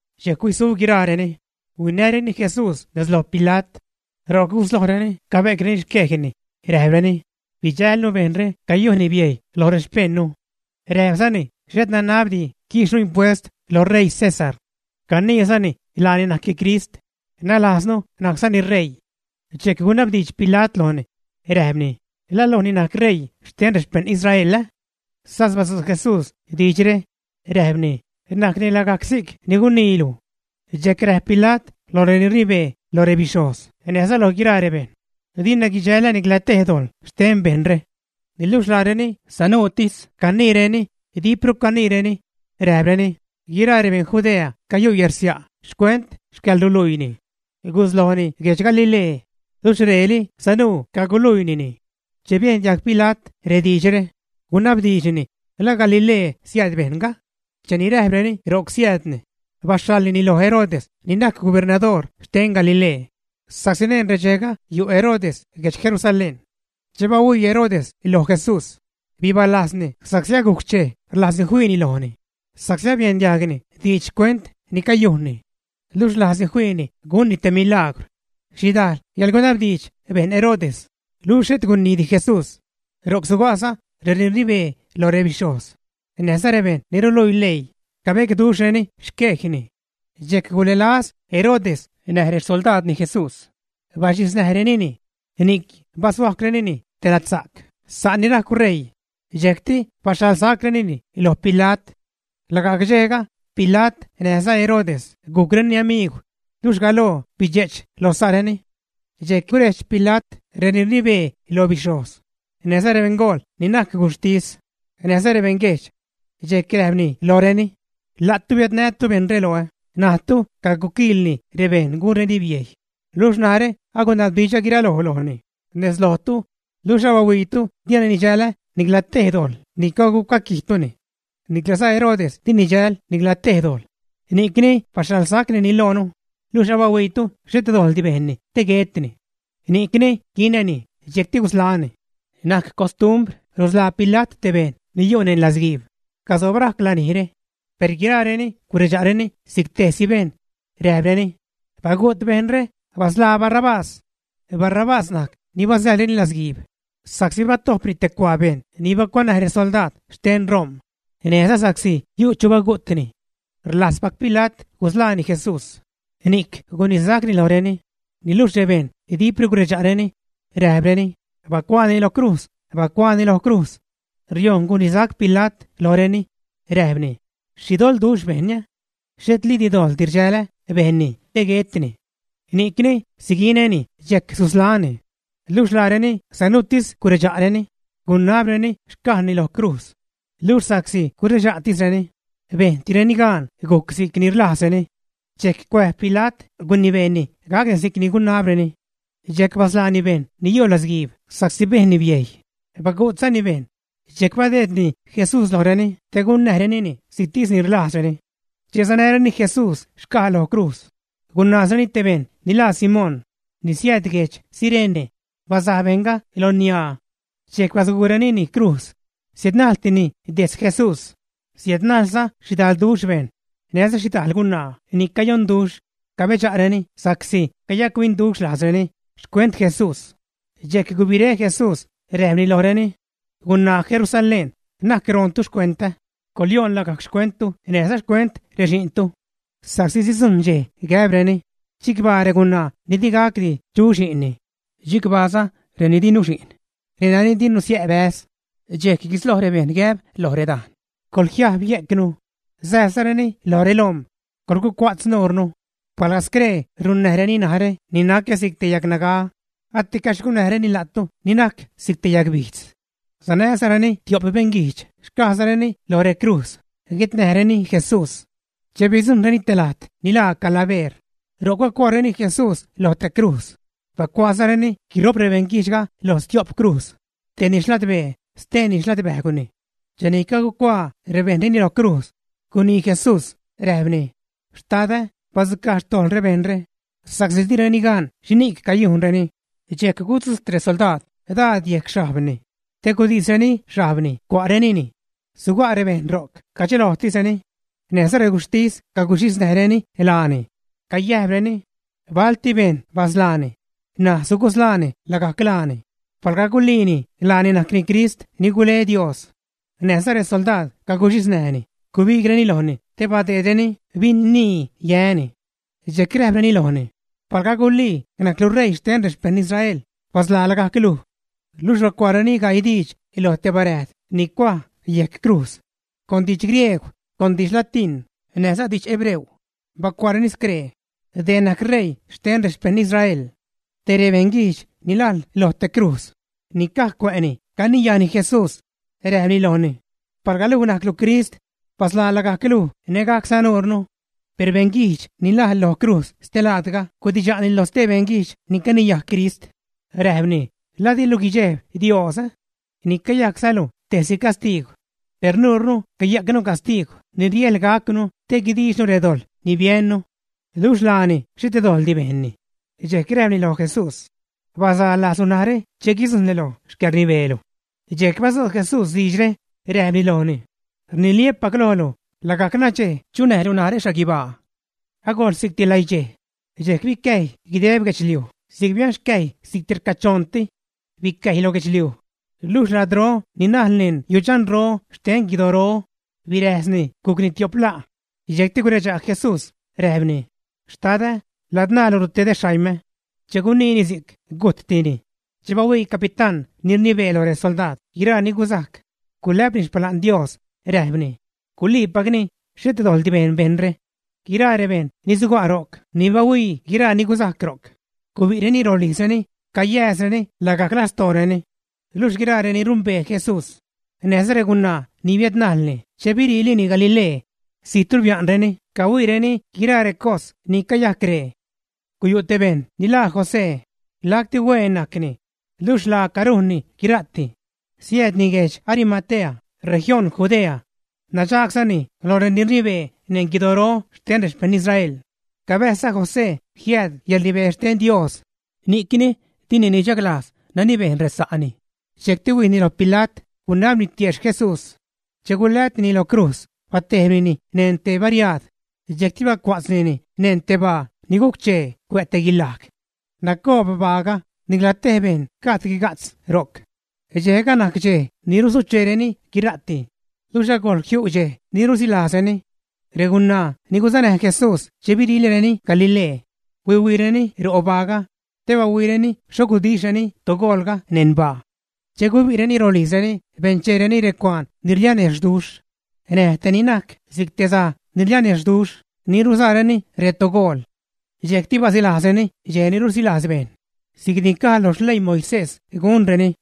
Dxejc huisu guiraareni, huinäreni Jesús nez loj Pila't. Ro'c guslojreni cabe'creni xquejni, räjpreni: ―Bidxälnu bejṉre cayujnni biejy lo rexpejṉnu. Räjpzani xhet nanabdi quiixnu impuest lo ṟeii César. Caniizani laani najcni Crist, nalajznu najczani ṟeii. Dxejc gunabdiidx Pila't lojni, räjpni: ―¿La luj ni najc ṟeii xten rexpejṉ Israel, ä? Sas badzu' Jesús diidxre räjpni: ―Najcni lagajc si'c ni guniilu. Dxejc räjp Pila't loj reni rnibee loj rebixhojz näjza loj guiraa rebejṉ: ―Dina guidxälä nicla tej dojḻ xten bejṉre. Niluxh laareni sanuutis caniireni, dipru caniireni, räjpreni: ―Guiraa rebeṉ Judea cayu' yärsia' xcuent xcäḻruluiini. Guslojni guedx Galilee, luxh reeli sanuu caguluiinini. Che biejn diajg Pila't rediidxre, gunabdiidxni: “¿La Galilee siääd bejṉga?” Cheni räjpreni ro'c siäädni, baxhaḻnini loj Herodes ni najc gubernadoor xten Galilee, sa'csi neṉ redxejga yu' Herodes guedx Jerusalén. Che bahuii Herodes loj Jesús, bibalajzni sa'csi agujc xchej rlajzni fiini lojni, sa'csi abiejn diagni diidx xcuent ni cayujnni. Luxh rlajzni fiini gunni te milaagwr. Xhidajl yäḻgunabdiidx bejn Herodes, luxh xhet guniidi Jesús. Ro'c suga'za reni rnibee loj rebixhojz näjza rebejṉ ni ruluii leii, cabecduxhrureni xquejni. Dxejc gulälaz Herodes näj rexsoldaadni Jesús, baxhiznäjrenini, ni'c bashuajcwrenini te ladsa'c sa' ni rajcw ṟeii, dxejcti baxhaḻsacrenini loj Pila't. Lagajc dxejga, Pila't näjza Herodes gujcreni amiigw, luxh galoo bidxe'ch lo sa'reni. Dxejc gurejdx Pila't reni rnibee loj bixhojz, näjza rebeṉgool ni najc guxhtis, näjza rebeṉguejdx. Dxejc räjpni lojreni: ―La'tu biädnätu bejṉre loä, najtu caguquiḻni rebejṉ gunreni biejy, luxh narä agunabdiidxä guiraloj lojni nez lojtu, luxh abahuiitu dina nidxälä nicla tej dojḻ ni cagucuaquijtuni. Niclaza Herodes di nidxäl nicla tej dojḻ, ni'cni baxhaḻsacnini loonu, luxh abahuiitu xhet dojḻdi bejnni te guetni. Ni'cni quinäni, dxjecti gusḻaä́ni. Najc costumbr rusḻaa Pila't te bejṉ ni yu' neṉ latzguiib casob rajc lanijre. Per guiraareni guredxa'reni si'c tejsi bejṉ, räjpreni: ―¡Bagu't bejṉre, basḻaa Barrabás! Barrabás najc ni basäḻreni latzguiib sa'csi batojpni te cuaa bejṉ ni bacuanäj resoldaad xten Rom̲, näjza sa'csi yu' chu bagu'tni. Rlajzpac Pila't gusḻaani Jesús, ni'c gunisacni lojreni, niluxh rebejṉ dipru guredxa'reni, räjpreni: ―¡Bacuaani lo crujz, bacuaani lo crujz! Riojṉ gunisac Pila't lojreni, räjpni: ―¿Xhi doḻduxh bejnni? Xhetlidi dojḻ rdxälä bejnni te guetni. Ni'cni siguinäni dxejc susḻaäni. Luxh laareni sanuutis guredxa'reni, gunabreni xcajni lo crujz. Luxh sa'csi guredxa'tisreni, bejntireni gaan gujc si'c ni rlajzreni. Dxejc cuäjb Pila't gunibeeni gac si'c ni gunabreni. Dxejc basḻaani bejṉ ni yu' latzguiib sa'csi bejnni biejy, bagu'tzani bejṉ, dxejc badeedni Jesús lojreni te gunnäjrenini si'ctis ni rlajzreni. Cheni sanäreni Jesús xcaj lo crujz, gunaazreni te bejṉ ni laa Simón ni siääd guedx Cirene; basaj bejṉga lo niaa. Dxejc basguurenini crujz, siädnajltini dejtz Jesús. Siädnajlza xhidalduxh bejṉ, näjza xhidajl gunaa ni cayonduxh, cabedxa'reni sa'csi cayac-huinduxh lajzreni xcuent Jesús. Dxejc gubiré Jesús, räjpni lojreni: ―Gunaa Jerusalén, na'c roontu xcuentä, coḻyoon lagajc xcuenttu näjza xcuent rexi'ntu. Sa'csi sidzujṉ dxej gäbreni: “Chicbaa regunaa ni di gacdi chu xi'nni, chicbaaza reni di nuxi'n, renani di nusiä' bäz.” Dxejc guisloj rebejṉ gäb loj redajn: “Coḻjiajb yejcnu”, säjbzareni loj relom̲: “Coḻgucua'tz nuurnu.” Palga scree runnäjreni narä ni nacä si'c te yagnaga, aticaxh gunnäjreni la'tu ni najc si'c te yagbijdz. Sanäzareni tio'p beṉguijdx xcajzareni loj recrujz, guetnäjreni Jesús. Che bidzujṉreni te lajt ni laa Calabeer, ro'c bacuaareni Jesús lo te crujz, bacuaazareni guiro'p rebeṉguijdxga lo stio'p crujz, tejni xladbee, steeni xladbäjgwni. Cheni cagucuaa rebejṉ reni lo crujz, gunii Jesús, räjpni: ―Xtadä, badzucaj xtojḻ rebejṉre, sa'csi direni gan xhini'c cayujnreni. Dxejc gudzujt resoldaad daad yejc xhajbni, te gudisreni xhajbni cua'renini. Suga' rebejṉ ro'c cadxelojtisreni. Näjza reguxhtis caguxhisnäjreni laani, cayäjpreni: ―Balti bejṉ basḻaani, ṉaj sugusḻaani lagajc laani palga guliini laani najcni Crist ni gule Dios. Näjza resoldaad caguxhisnäjni, gubigreni lojni te badeedreni bin-nii yäni. Dxejc räjpreni lojni: ―Palga gulii najclu ṟeii xten rexpejṉ Israel, basḻaa lagajc luj. Luxh bacuaareni gaii diidx loj te baräjd ni cuaj yejc crujz. Con didx griegw, con didx latíṉ, näjza didx hebreo, bacuaareni scree: “Dee najc Reii xten rexpeṉ Israel.” Te rebeṉ guijdx ni najl lo te crujz ni caj cuä'ni caniyajni Jesús, räjpni lojni: ―Palga luj najclu Crist, basḻaa lagajc luj nägajcza nuurnu. Per beṉguijdx ni najl lo crujz stelaadga gudidxa'ni loj stee beṉguijdx ni caniyaj Crist, räjpni: ―¿La dilu guidxejb Dios? ¡Ni cayajczalu tejsi castiigw! Per nuurnu cayajcnu castiigw ni riäjḻ gacnu te guidiixnu redojḻ ni biennu. Luxh laani xhet dojḻdi bejnni. Dxejc räjpni loj Jesús: ―Bazalajzlu narä che guidzujṉlu lo xcäḻrnibeelu. Dxejc badzu' Jesús diidxre, räjpni lojni: ―Rniliä́pac lojlu, lagajc nadxej chunäjlu narä xhaguibaa. Agojl si'cti läidxej. Dxejc bicäjy guideb guedxliuj, si'c bianxcäjy si'cti rcachoṉti. Bicäjy lo gubijdx, luxh ladró ni najl neṉ yudxanro xten guidoro, biräjsni gucni tio'p la'. Dxejcti guredxa' Jesús, räjpni: ―Xtadä, ladzṉaalu rutedä xaimä. Che guniini si'c, gujttini. Che bahuii capitán ni rnibee loj resoldaad guiraa ni guzajc, gulä'pni xpala'n Dios, räjpni: ―Guliipacni, xhet dojḻdi bejn bejṉre. Guiraa rebejṉ ni suga' ro'c ni bahuii guiraa ni guzajc ro'c, gubi'reni rolijzreni, cayääzreni lagajc lastooreni. Luxh guiraa reni rumbee Jesús, näjza regunaa ni biädnajlni che biriilini Galilee, zijtru bia'nreni cahuiireni guiraa recos ni cayajcre. Guyu' te bejṉ ni laa José, lacti huen najcni, luxh laaca rujnni guira'ti. Siäädni guedx Arimatea, región Judea. Nadxaagzani loj reni rnibee neṉ guidoro xten rexpejṉ Israel. Cabäjzza José jiääd yäḻrnibee xten Dios, ni'cni dini nidxaglajz nani bejn resa'ni. Dxejcti huijni lo Pila't, gunabni tiejxh Jesús. Che gulätnini lo crujz, batejbnini neṉ te bariaad, dxejcti bacua'tznini neṉ te baa ni guc-chee cuä' te guilaj. Nacoob baaga, nicla tej bejṉ gajd guiga'tz ro'c. Dxejga najc dxej ni rusucheereni guira'ti, luxh agojl jiu' dxej ni rusilajzreni. Regunaa ni guzanäj Jesús che biriilini Galilee huihuiireni robaaga te bahuiireni xho gudixhreni togoolga neṉ baa. Che gubi'reni rolijzreni bencheereni recuaan ni rlianexhduxh näj te ni najc si'c te saj ni rlianexhduxh ni ruzaareni retogool. Dxejcti basilajzreni dxej ni rusilajz bejṉ, si'cni caj lo xleii Moisés gunreni.